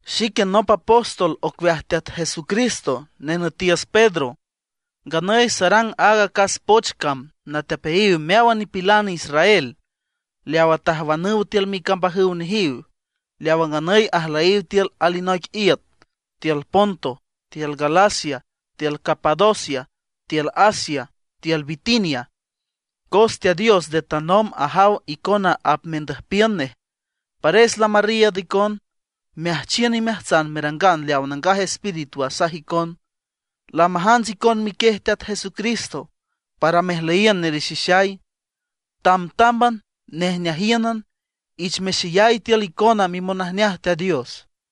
Xique nop apóstol ocueaj Teat Jesucristo, nenütiüs Pedro. Nganüy sarang aaga acas poch cam natepeayiw meáwan nipilan israel leawa tajwanüw tiül micambajüw nejiw, leawa nganüy ajlüyiw tiül alinoic iüt, tiül Ponto, tiül Galacia, tiül Capadocia, tiül Asia, tiül Bitinia. Cos Teat Dios nde tanomb ajaw icona apmendüjpiün nej; pares lamarriiüd icon meajchiün imeajtsan merangan leawa Nangaj Espíritu asaj icon. Lamajants icon miquiej Teat Jesucristo para mejlüyiün nerexixay. Tamtámban nejneajíünan, ich mexeyay tiül icona mimonajneaj Teat Dios.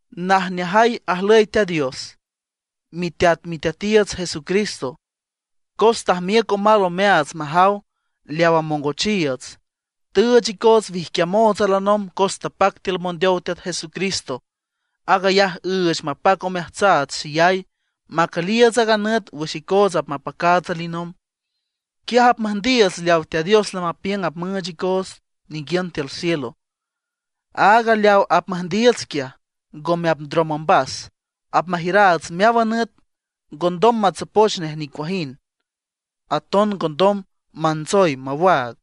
Najneajay ajlüy Teat Dios, Miteat Miteatiiüts Jesucristo, cos tajmiüc omal omeaats majaw leaw amongochiiüts. Tüüch icoots wijquiamoots alinomb cos tapac tiül mondeow Teat Jesucristo. Aag ayaj üüch mapac omeajtsaats xeyay macüliiüts aaga nüt wüx icoots apmapacaats alinomb. Quiaj apmüjndiiüts leawa Teat Dios lamapiüng apmüüch icoots ninguiün tiül cielo. Aaga leaw apmüjndiiüts quiaj, ngome apndrom ombas, apmajiüraats meáwan nüt. Ngondom matsopoch nej nicuajind; aton ngondom mantsoy mawaag.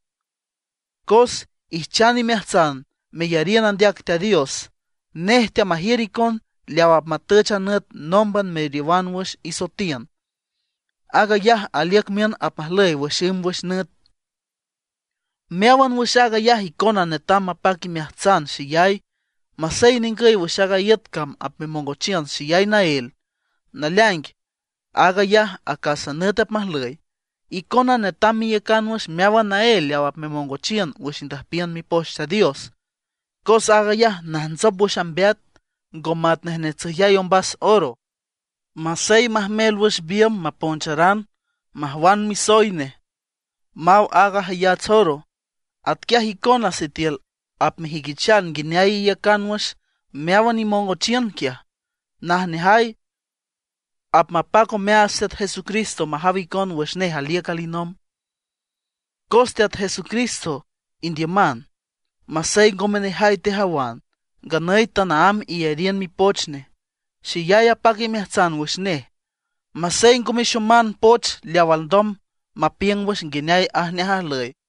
Cos ijchan imeajtsan meyariün andeac Teat Dios, nej teamajiür icon leaw apmatüch a nüt nómban meriowan wüx isoetiün. Aag ayaj aliüc miün apmajlüy wüx ümb wüx nüt. Meáwan wüx aag ayaj icona netam mapac imeajtsan xeyay, masey ningüy wüx aaga iüt cam apmemongochiün xeyay naél. Naleaing aag ayaj acásan nüt apmajlüy. Icona netam meiücan wüx meáwan naél leaw apmemongochiün wüx indüjpiün Mipoch Teat Dios, cos aag ayaj najntsop wüx ambeat, ngo matnej netsüjyay ombas oro. Masey majmel wüx biümb maponcharan majwan misoy nej maw áagan jayats oro. Atquiaj icona sitiül apmejüiquichan nguineay iiücan wüx meáwan imongochiün quiaj, najneajay apmapac omeaats Teat Jesucristo majaw icon wüx nej aliüc alinomb. Cos Teat Jesucristo indiüman, masey ngome nejay tejawan, nganüy tanaámb iyariün mipoch nej. Xeyay apac imeajtsan wüx nej, masey ngo mexoman poch leaw alndom mapiüng wüx nguineay ajneaj ajlüy.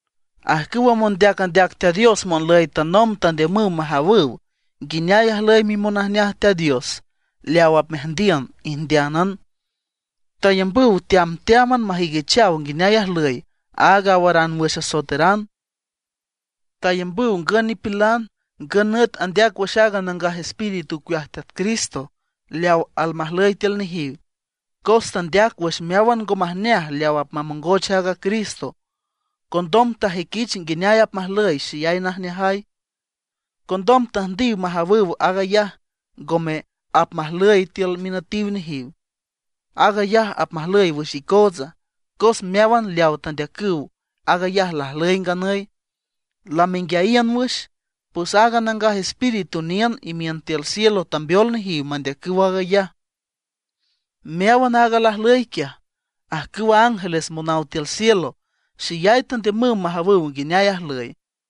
Ajcüwa mondeac andeac Teat Dios monlüy tanomb tandiümüw majawüw nguineay ajlüy mimonajneaj Teat Dios leaw apmeajndiün, ijndeánan. Tayambüw teamteáman majüiquichaw nguineay ajlüy aaga awaran wüx asoeteran. Tayambüw ngün nipilan ngün nüt andeac wüx aaga Nangaj Espíritu ocueaj Teat Cristo leaw almajlüy tiül nejiw. Cos tandeac wüx meáwan ngo majneaj leaw apmamongoch aaga Cristo, condom tajuiquich nguineay apmajlüy xeyay najneajay. Condom tüjndiw majawüw aag ayaj ngome apmajlüy tiül minütiw nejiw; aag ayaj apmajlüy wüx icootsa. Cos meáwan leawa tandeacüw, aag ayaj lajlüy nganüy, lamenguiayiün wüx. Pues aaga Nangaj Espíritu niün imiün tiül cielo tambeol nejiw mandeacüw aag ayaj. Meáwan aaga lajlüy quiaj, ajcüwa ángeles monaw tiül cielo xeyay tandiümüw majawüw nguineay ajlüy.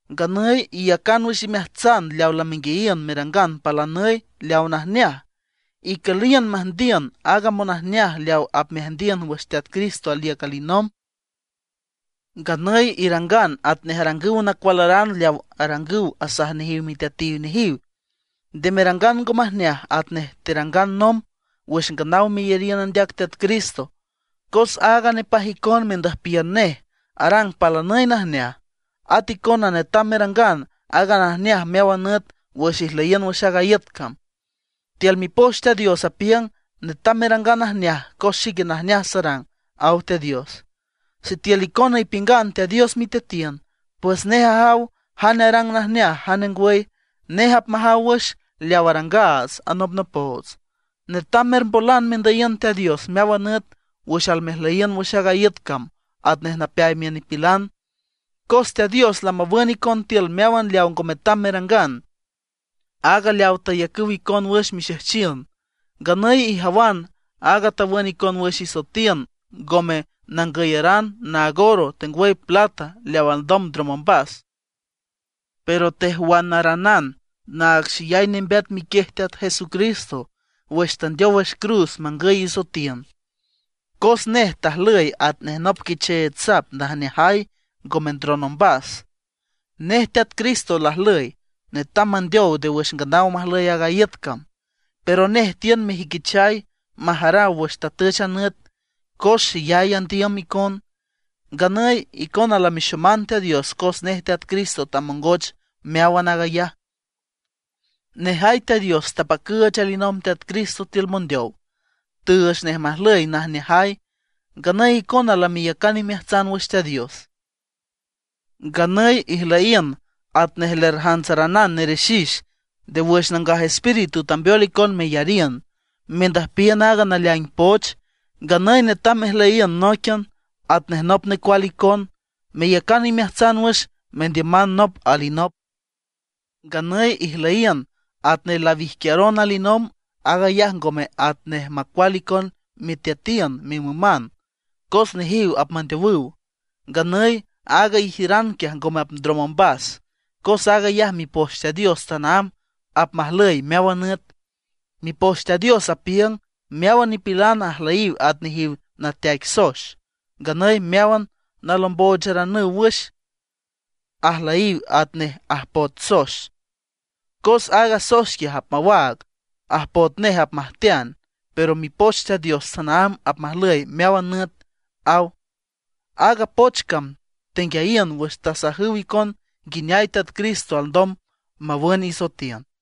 Nganüy iyacan wüx imeajtsan leaw lamenguiayiün, merangan palanüy leawa najneaj. Icüliün meajndiün aaga monajneaj leaw apmeajndiün wüx Teat Cristo aliüc alinomb. Nganüy irangan atnej arangüw nacualaran leaw arangüw asaj nejiw miteatiw nejiw. Nde merangan ngo majneaj atnej terangan nomb wüx nganaw meyariün andeac Teat Cristo. Cos aaga nepaj icon mendüjpiün nej arang palanüy najneaj; at icona netam merangan áagan najneaj meáwan nüt wüx ijlüyiün wüx aaga iüt cam. Tiül Mipoch Teat Dios apiüng: “Netam merangan najneaj cos xique najneaj sarang”, aw Teat Dios. Sitiül icona ipiüngan Teat Dios miteatiün, pues nej ajaw jane arang najneaj jane ngwüy; nej apmajaw wüx leawa arangaats anopnopoots. Netam mermbolan mendüyiün Teat Dios meáwan nüt wüx almejüyiün wüx aaga iüt cam atnej napeay miün nipilan. Cos Teat Dios lamawün icon tiül meáwan leaw ngo metam merangan, áag leawa tayacüw icon wüx mixejchiün. Nganüy ijawan aaga tawün icon wüx isoetiün ngome nangüyaran naag oro tengwüy plata leaw alndom ndrom ombas. Pero tejwanaranan naag xeyay nembeat miquiej Teat Jesucristo wüx tandeow wüx cruz mangüy isoetiün. Cos nej tajlüy atnej nop quicheech sap najneajay, ngome ndron ombas. Nej Teat Cristo lajlüy netam mandeow nde wüx nganaw majlüy aaga iüt cam, pero nej tiün mejuiquichay majaraw wüx tatüch a nüt, cos xeyay andiüm icon. Nganüy icona lamexoman Teat Dios cos nej Teat Cristo tamongoch meáwan aag ayaj. Nejay Teat Dios tapacüüch alinomb Teat Cristo tiül mondeow; tüüch nej majlüy najneajay. Nganüy icona lameyacan imeajtsan wüx Teat Dios. Nganüy ijlüyiün atnej lerjantsaranan nerexix nde wüx Nangaj Espíritu tambeol icon meyariün, mendüjpiün aaga naleaing poch. Nganüy netam mejlüyiün nóiquian atnej nop necual icon, meyacan imeajtsan wüx mendiüman nop alinop. Nganüy ijlüyiün atnej lawijquiaron alinomb; aag ayaj ngome atnej macual icon miteatiün mimüman, cos nejiw apmandeowüw. Nganüy aaga ijiüran quiaj ngome apndrom ombas, cos aag ayaj Mipoch Teat Dios tanaámb apmajlüy meáwan nüt. Mipoch Teat Dios apiüng: Meáwan nipilan ajlüyiw at nejiw nateaic soex, nganüy meáwan nalombocharanüw wüx, ajlüy atnej ajpoet soex. Cos aaga soex quiaj apmawaag, ajpoet nej apmajtean; Pero Mipoch Teat Dios tanaámb apmajlüy meáwan nüt, aw. Aaga poch cam tenguiayiün wüx tasajüw icon nguineay Teat Cristo alndom mawün isoetiün.